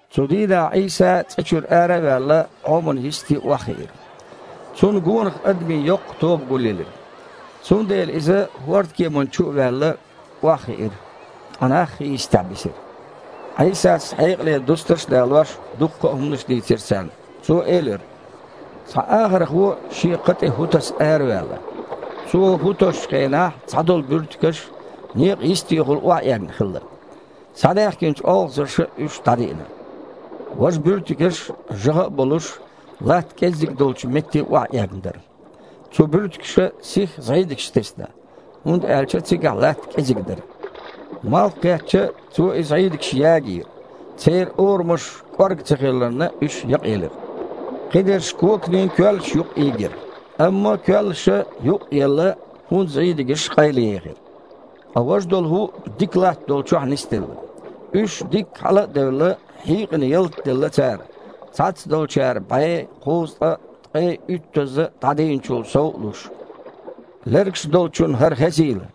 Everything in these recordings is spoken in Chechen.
Цу дийнахь Іийса, цІа чуьра ара а ваьлла, Іоман йисте охьахиира. Цунна гонах адамийн йоккха тоба гулъелира. Цундела Иза, хІордан кеманна чу а ваьлла, охьахиира, ткъа нах хи йистехь бисира. Іийсас, хьекъале дустарш а далош, дуккха а хІуманаш дийцира царна. Цо элира: «Цхьа ахархо шен кха тІе хІу таса араваьлла. Цо хІу тосучу хенахь цхьадолу буьртигаш некъан йистехула охьаэгна хилла. Схьадаьхкинчу олхазарша уьш дІадиъна. Важа буьртигаш, жагІа а болуш, латта кІеззиг долчу метте охьаэгна дара. Цу буьртигаша сихха зІийдигаш тесна, хІунда аьлча цигахь латта кІезиг дара. Малх кхетча, цо и зІийдигаш ягийра, церан орамаш кІорга ца хиларна, уьш якъаелира. Кхидерш коканийн коьллаш юкъа ийгира, амма коьллаша, юкъ а елла, хІун зІийдигаш къайлаехира. Ткъа важа долу хІу дика латта долчохь нисделла. Уьш дикка хьала а девлла, хьийкъина ялта делла цара, цхьацца долчара бІе, кхузткъа, ткъе уьттазза дІадийначул сов а луш. Лергаш долчунна хІара хезийла!»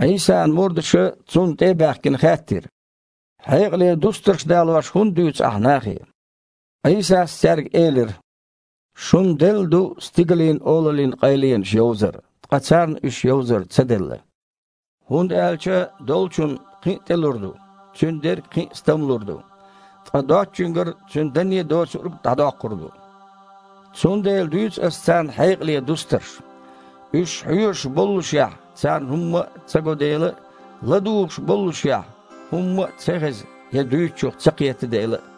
Іийсан мурдаша, Цунна тІе а баьхкина, хаьттира: «Хьекъале дустарш далош хІунда дуьйцу Ахьа нахе?» Іийсас цаьрга элира: «Шуна делла ду Стигалийн Олаллин къайленаш йовзар, ткъа царна уьш йовзар ца делла. ХІунда аьлча долчунна кхин а тІелур ду, цуьнан дерг кхин а стамлур ду. Ткъа доцучуьнгара цуьнан данне а доцург а дІадоккхур ду. Цундела дуьйцу Аса царна хьекъале дустарш. Уьш хьоьжуш боллушехь, царна хІумма а ца го дела а, ладугІуш боллушехь, хІумма а ца хеза я дуьйцучух ца кхета дела а.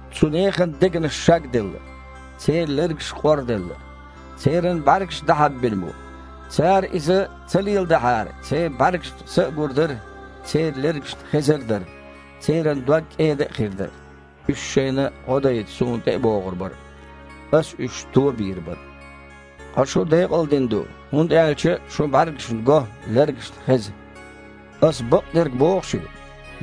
Цу нехан дегнаш шагделла, церан лергаш къорделла, церан бІаьргаш дІахьаббина бу. Цара иза ца леладахьара, церан бІаьргашна са а гур дара, церан лергашна хезар а дара, церан дог кІеда а хир дара, уьш шайна гІо дайта Суна тІе а богІур бара, Аса уьш то а бийр бара!“ Ткъа шу декъалдина ду, хІунда аьлча шун бІаьргашна го, лергашна хеза. Аса бакъдерг боху шуьга: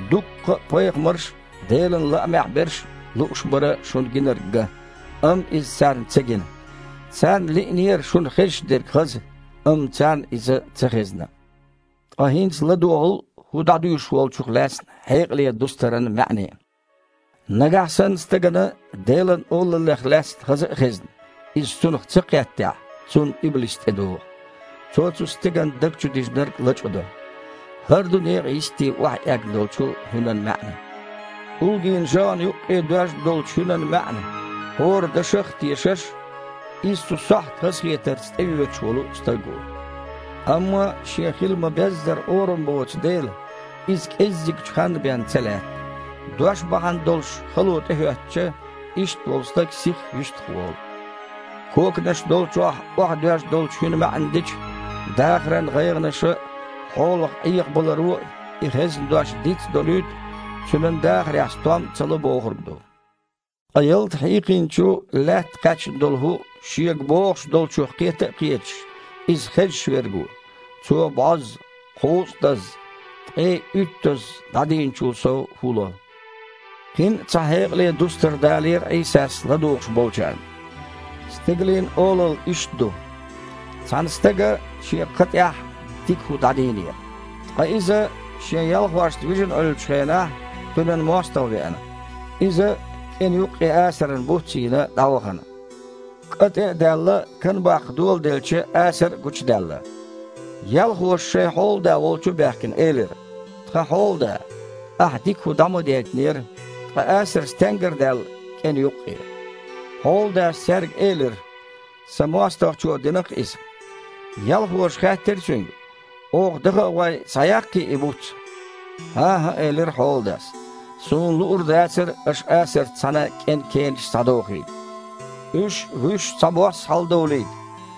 дуккха а пайхамарш а, Делан лаамехь берш а лууш бара шуна гинарг ган, амма иза царна ца гина. Царна лиънера шуна хезаш дерг хаза, амма царна иза ца хезна». «Ткъа хІинца ладогІал хІу дІадуьйш волчух лаьцна хьекъале дустаран маьІне. Нагахь санна стагана Делан Олаллех лаьцна хаза а хезна, иза цунах ца кхеттехь, цунна иблис тІедогІу. Цо цу стеган даг чу дижинарг лачкъадо. ХІара ду некъан йисте охьаэгна долчу хІуьнан маьІна. ТІулгийн жагІанна юккъе доьжна долчу хІуьнан маьІна, хІора дашах а тешаш, иза цу сохьта хазахетарца тІеоьцуш волу стаг ву. Амма шен хила ма-беззара орам боцу дела, иза кІеззигчу ханна бен ца лаьтта. Дош бахьана долуш хало тІехІоьттича, иштта волу стаг сихха юьстах волу. Коканаш долчохь охьадоьжна долчу хІуьнан маьІна дича, дахаран гІайгІанаша а, хьолах Іехабаларо а и хезна дош диц а долуьйту, цуьнан дахарехь стом а ца ло бохург ду. Ткъа ялта хьийкъинчу лаьтта кхаьчна долу хІу – шега бохуш долчух кхета а кхеташ, иза хезаш верг ву. Цо бІозза, кхузткъазза, ткъе уьттазза дІадийначул сов хІу ло». Кхин а цхьа хьекъале дустар далийра Іийсас ладугІуш болчарна: «Стигалийн Олалла иштта ду. Цхьана стага шен кха тІехь дика хІу дІадийнера. Ткъа иза шен ялхошца вижина Іуьллучу хенахь кхуьнан мостагІа веана. Иза, кІена юккъе асаран буц а йийна, дІавахана. КІа, тІе а даьлла, кан баккха доладелча, асар а гучудаьлла. Ялхоша, шайн хьолада волчу а баьхкина, элира: „Тхан хьолада, ахьа дика хІу дІа ма дейтинера, ткъа асар стенгара даьлла кІена юккъе?“ Хьоладас цаьрга элира: „Сан мостагІчо дина-кх иза“. Ялхоша хаьттира цуьнга: „Оха, даха а гІой, схьаяккхий и буц?“ „ХІан-хІа, – элира хьоладас. – Суна луур дацара аша асарца цхьаьна кІен кенаш схьадохийла. Уьш а, вуьш а цхьабосса хьаладовлийта.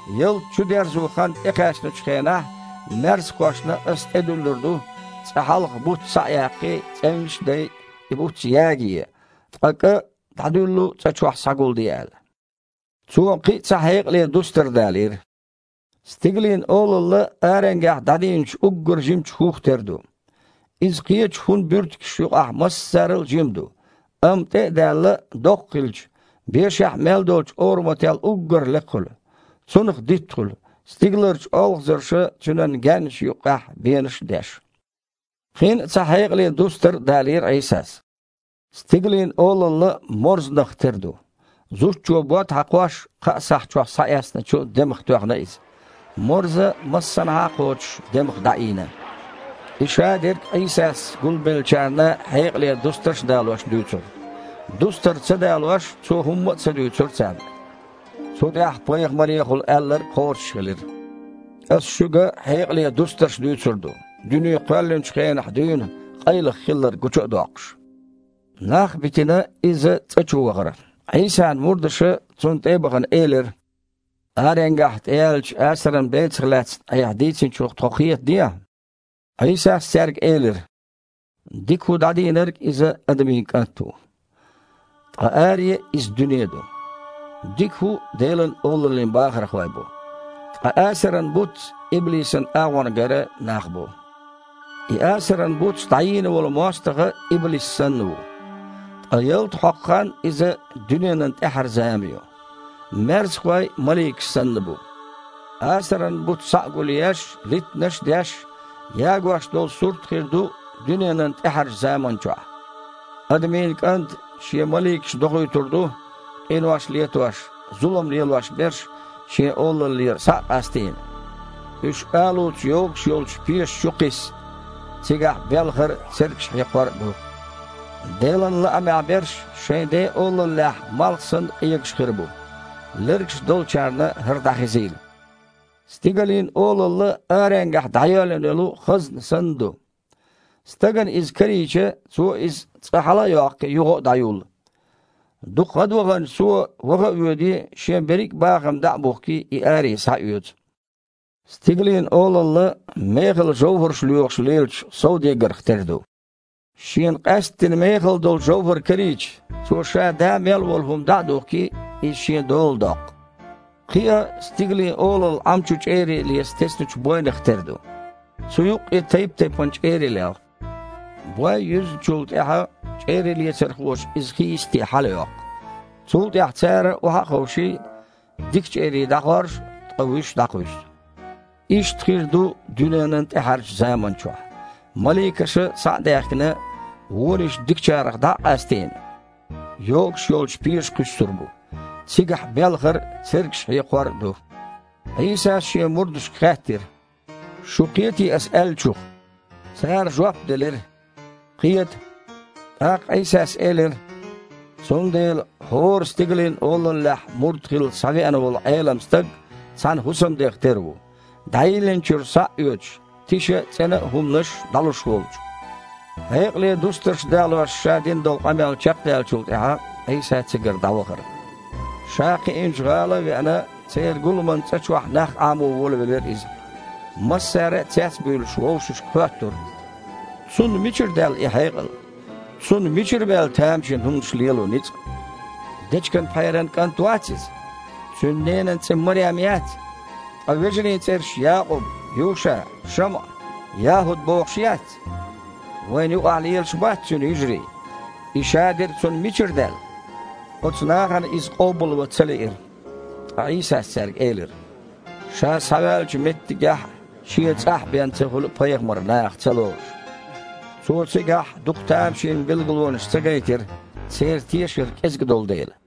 Ялта чудерзон хан тІекхаьчначу хенахь маьрсхошна аса тІедуьллур ду, цкъа хьалха буц схьа а яккхий, цІевнаш а дай, и буц ягае, ткъа кІа дІадуьллу цІа чохь схьагулде аьлла“». Цо кхин а цхьа хьекъале дустар далийра: «Стигалийн Олалла аренгахь дІадийначу уггар жимачу хІух тера ду. Иза кхечу хІун буьртигаш юкъахь массарал а жима ду, амма, тІе а даьлла, доккха хилча, бешахь мел долчу орамател уггар а лекха хуьлу. Цунах дитт хуьлу, стигаларчу олхазарша цуьнан гаьннаш юккъехь бенаш а деш». Кхин а цхьа хьекъале дустар а далийра Іийсас: «Стигалийн Олалла морзанах тера ду. Зудчо, бод хьакхош, кхаа сахь чохь схьаэцначу демах тоьхна иза. Морза, массанхьа а кхочуш, демах дІаийна». И шадерг а Іийсас гулбеллачарна хьекъале дустарш далош дуьйцура. Дустар ца далош, Цо хІумма а ца дуьйцура царна. Цу тІехь пайхамарехула аьлларг кхочушхилира: «Аса шуьга хьекъале дустарш дуьйцур ду, дуьне кхоьллинчу хенахь дуьйна къайлаха хилларг гучу а доккхуш». Нах а битина, Иза цІа чу вахара. Іийсан мурдаша, Цунна тІе а бахана, элира: «Аренгахь тІеяьллачу асаран бецах лаьцна Айхьа дийцинчух тхо кхетадехьа». Іийсас цаьрга элира: «Дика хІу дІадийнарг – Иза Адамийн КІант ву. Ткъа аре – иза дуьне ду. Дика хІу – Делан Олаллин бахархой бу. Ткъа асаран буц иблисан агІонгара нах бу. И асаран буц дІайийна волу мостагІа иблис санна ву. Ткъа ялта хьокху хан – иза дуьненан тІаьхьара зама ю. Маьрсахой маликаш санна бу. Асаран буц схьа а гулъеш, литтанаш а деш, ягош долу сурт хир ду дуьненан тІаьхьарчу заманчохь. Адамийн КІанта Шен маликаш дохуьйтур ду, къинош летош, зулам лелош берш Шен Олаллера, схьа а къастийна, уьш алуца йогуш йолчу пеша чу кхисса. Цигахь белхар а, цергаш хьекхор а ду. Делан лаамехь берш шайн Ден Олаллехь, малх санна, къегаш хир бу. Лергаш долчарна хІара дІахезийла». «Стигалийн Олалла аренгахь дІайоьллина йолу хазна санна ду. Стагана иза карийча, цо иза цкъа хьала а йоккхий, юха а дІаюллу. Дукха гІадваханчу цо, ваха а воьдий, шен берриг а бахам дІа а бухкий, и аре схьаоьцу. Стигалийн Олалла мехала жовхІарш лоьхуш лелачу совдегарх тера ду. Шена къаьсттина мехала долу жовхІар карийча, цо ша да мел волу хІума дІа а духкий, иза шен дола доккху. Кхин а Стигалийн Олалла Іам чу чІерий леца тесначу бойнах тера ду. Цу юккъе тайп-тайпана чІерий лелха. Бой юьзначул тІаьхьа, чІерийлецархоша иза хийисте хьалайоккху. Цул тІаьхьа цара, охьа а ховший, дика чІерий дІахоржу, ткъа вуьш дІакхуьссу. Иштта хир ду дуьненан тІаьхьарчу заманчохь. Маликаша, схьа а даьхкина, вониш дикачарах дІа а къастийна, йогуш йолчу пеша кхуьссур бу. Цигахь белхар а, цергаш хьекхор а ду». Іийсас Шен мурдашка хаьттира: «Шу кхетий Аса аьллачух?» Цара жоп делира: «Кхета». ТІаккха Іийсас элира: «Цундела хІора Стигалийн Олаллехь мурд хилла схьавеана волу Іелам стаг цхьана хІусамдех тера ву, дІайиллинчуьра схьа а оьцуш, тиша а, цІена а хІуманаш дІалуш волчу». Хьекъале дустарш далош Ша дина долу къамел чекхдаьллачул тІаьхьа, Іийса цигара дІавахара. Ша кхиинчу гІала а веана, церан гуламан цІа чохь нах Іамо волавелира Иза. Массара а, цец а буьйлуш, вовшашка хоьттура: «Цунна мичара даьлла и хьекъал? Цунна мичара баьлла тамашийна хІуманаш лело ницкъ? Дечиган пхьеран кІант вац Иза? Цуьнан ненан цІе Марем яц? Ткъа вежарийн цІераш Якъуб, Юша, ШамІа, ЯхІуд бохуш яц? Вайна юкъахь лелаш бац Цуьнан йижарий? И шадерг а Цунна мичара даьлла?» Оцу нахана Иза къобалван ца лиира. Ткъа Іийсас цаьрга элира: «Ша схьаваьллачу меттигехь а, шен цІахь а бен ца хуьлу пайхамар наха ца лоруш». Цо цигахь дукха тамашийна билгалонаш ца гайтира, церан тешар кІезиг долу дела.